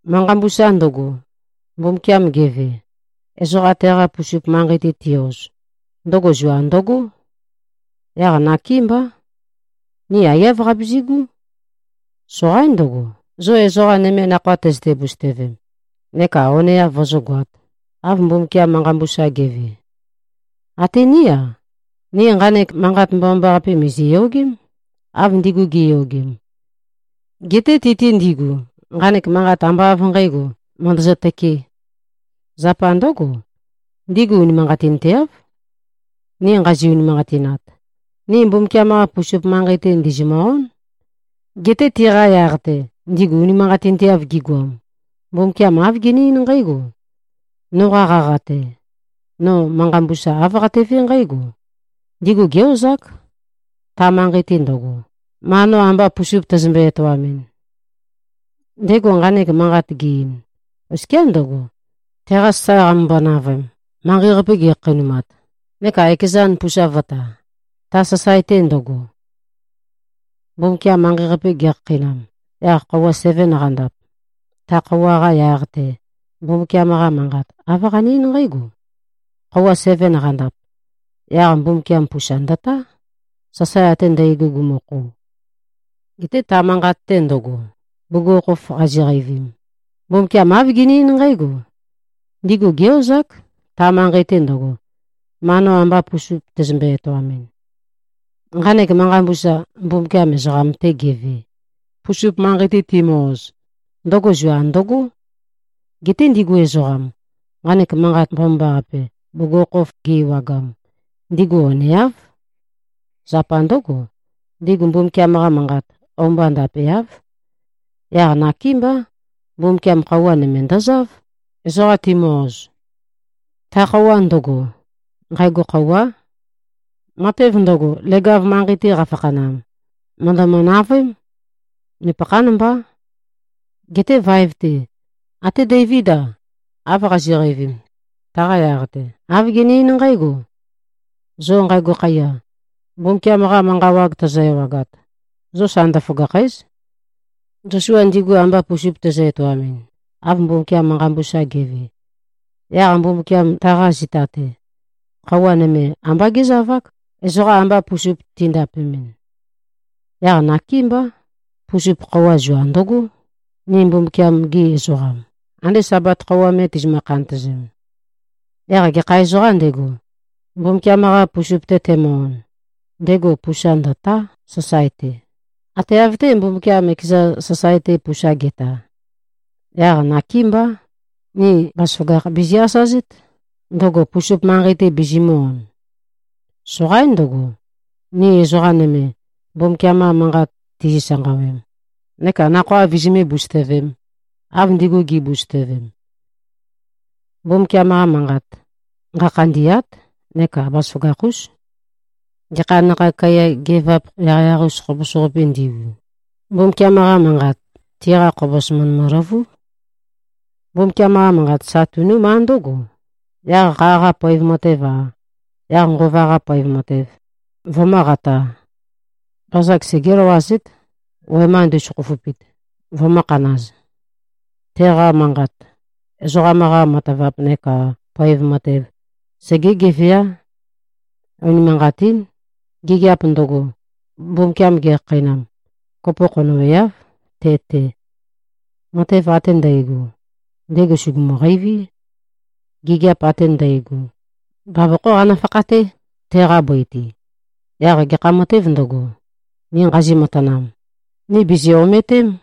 Manqa mbusa ndøgo, Mbumbukiam geve, ezoqa teqa pusup manqei-te ti-oz, ndøgo zua ndøgó. Yaq nakémbá. Ni aiyáv qabizigú. Soqaín ndøgo, zo ezoqa nøme nakhoa tøzøte-busøtøvem, neka oneav vozógoāt, av Mbumbukiam manqa mbusa ge꞉ve. Até ní-a, ni nqanek manqat mbomambaqape mìziyogém, av ndigu gi꞉yogem. Geté ti-te ndigu, nqanek manqat ambá av nqǣgo, mø̀ndøzø-tøkē. Zapa ndǿgo, ndigu unimanqatinteáv. Ni nqazi-unimanqatinat, ni Mbumbukiam-qa pusup manqei-te, ndìzimø-ón. Geté tiqa yaq-te, ndigu unimanqatinteav gigoam, Mbumbukiam āv gene-eín nqǽgo, “Noqa qaqa-te, no manqa mbusa āv qatevé nqǽgo, ‘Ndigu gé-ozák, ta manqei-te ndøgo, ma no amba pusup tæzømbe-etoamɨn.’” Ndego nqanek manqat ge-ein, oskiá ndøgo, teqa sasae qamømbo-navøem, manqei-qape gekhakheinumat, neka ekezan pusa vø̄ta, ta sasae-te ndøgo. Mbumbukiam manqei-qape gekhakheinam, yaq khøuwa seven qandap, ta khøuwa-qa yaq-te, Mbumbukiam-qa Manqat, āv qane-eín nqǽgo, “Khøuwa seven qandap, yaq Mbumbukiam pusa ndøtá, sasae ate ndægo gumukhou.” Geté ta manqat-te ndøgo, bugukhokhof qaziqeivim, Mbumbukiam āv gene-eín nqǽgo, “Ndigu gé-ozák, ta manqei-te ndøgo, ma no amba pusup tæzømbe-etoamɨn.” Nqanek manqa mbusa, Mbumbukiam ezoqam-te geve, pusup manqei-te timø-oz, ndøgo zua ndøgó. Geté ndigu ezoqam, nqanek manqat mbomambaqape bugukhokhof gi-ewagam, ndigu oneáv. Zapa ndǿgo, ndigu Mbumbukiam-qa manqat, o-mba ndapeáv. Yaq nakémbá, Mbumbukiam khøuwa nøme ndøzáv, ezoqa timø-oz. Ta khøuwa ndøgo, nqægo khøuwá. Matev ndøgo, leg-av manqei-te qafakhanam, mø̀ndømø-navøém. Nupøkhán mbá. Geté vaev-te, até Deivíd-a, av qazi꞉qeivim, taqa yaq-te, āv gene-eín nqǽgo, “Zo nqægo khaiya, Mbumbukiam-qa manqa wag tozo-ewagat, zo sa ndøføgàkhæ᷄z.” Zosua ndigu amba pusup tezø-etoamɨn, av Mbumbukiam manqa mbusa ge꞉ve, yaq Mbumbukiam taqa zita-te, khøuwa nøme ambá gézavák, ezoqa amba pusup tindapemɨn. Yaq nakémbá, pusup khøuwa zua ndøgó, ni Mbumbukiam-gi ezoqam, ande Sabat khøuwa me tizimø-khantøzem. Yaq gekha ezoqām ndego, Mbumbukiam-qa pusup-te temø-on, ndego pusa ndø̀tá, sasae-te, ate av-té, Mbumbukiam ekeza sasae-te pusa ge꞉ta. Yaq nakémbá, ni bazaføgakh bizi-asazét, ndøgo pusup manqei-te bizimø̄-on. Soqaín ndøgo, ni ezoqa nøme, Mbumbukiam-qa manqat tizi-sanqawem neka nakhoa vizimé-busøtøvēm, av ndigu gi꞉busøtøvem. Mbumbukiam-qa Manqat, nqakhandî꞉át neka bazaføgakh-ús. Gekha nakhag kaiya geøvap yaqyaq-us khobos-qapī ndigu, Mbumbukiam-qa Manqat, tiqa khobos mø̀ndømø-løvúb. Mbumbukiam-qa Manqat sa tunúmá ndǿgo, yaq kha-qa poev matev-a, yaq Nqova-qa poev matev, vømǿqatā. Bazag segé-løwazét, wema ndu꞉søkhoføpit, vømǿkhanāz. Teqa manqat, ezoqam-qa matavap neka poev matev, segé-geveá. Unimanqatín. Gigiap ndøgo, Mbumbukiam gekhakheinam, kopo khonøweáv, te-te. Matev ate ndægo, ndego sùgumu-qeiví. Gigiap ate ndægo, bavokhó qanø-fakhaté, teqa bøi-te. Yaq gekha matēv ndøgo, ni nqazi-matanam, ni bìzi꞉-omøtém.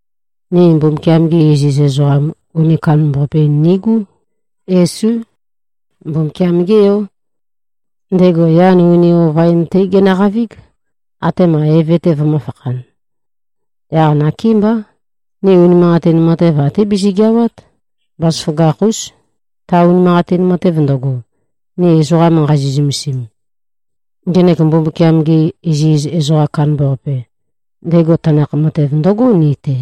Ni Mbumbukiam-ge iziz ezoqam uni kandambaqape-in nigú. Yesú. Mbumbukiam-gé Yó. Ndego yan uni ova-in-té genøqavíg, atema Eve-te vømø̄fakhan. Yaq nakémbá, ni unimanqatin matev, até bizigeawát, bazaføgakh-ús, ta unimanqatin matev ndøgo, ni ezoqa nqazi꞉-zømesim. Ngenek Mbumbukiam-ge iziz ezoqam kandambaqape, ndego tanakh matev ndøgó ni-te.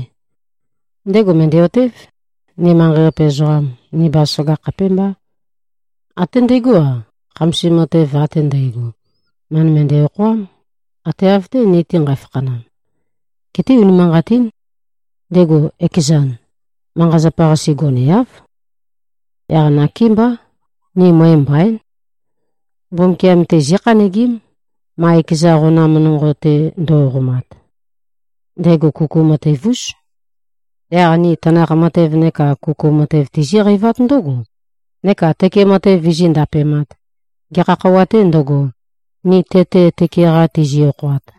Ndego mø̀ndæ-otév, ni manqei-qape ezoqam, ni bazaføgakh khapémbá. Até ndegó-a, khamasim matev ate ndægo, mø̀ndømøndæ-okhoám, ate av-té, ni-te nqæfakhanam. Geté, unimanqatín. Ndego ekezan, manqa-zapa-qase goneáv. Yaq nakémbá, ni møe mbaín. Mbumbukiam-te zíkhanøgím, ma ekeza qonam nonqo-te ndo꞉qomat. Ndego kuku matev-ús. Yaq ni tanakh matev neka kuku matev tizíqeivát ndǿgo, neka tøke matev vizí-ndapemāt, gekha khøuwa-tē ndøgo, ni te-te tøke-qa tizi-okhoat.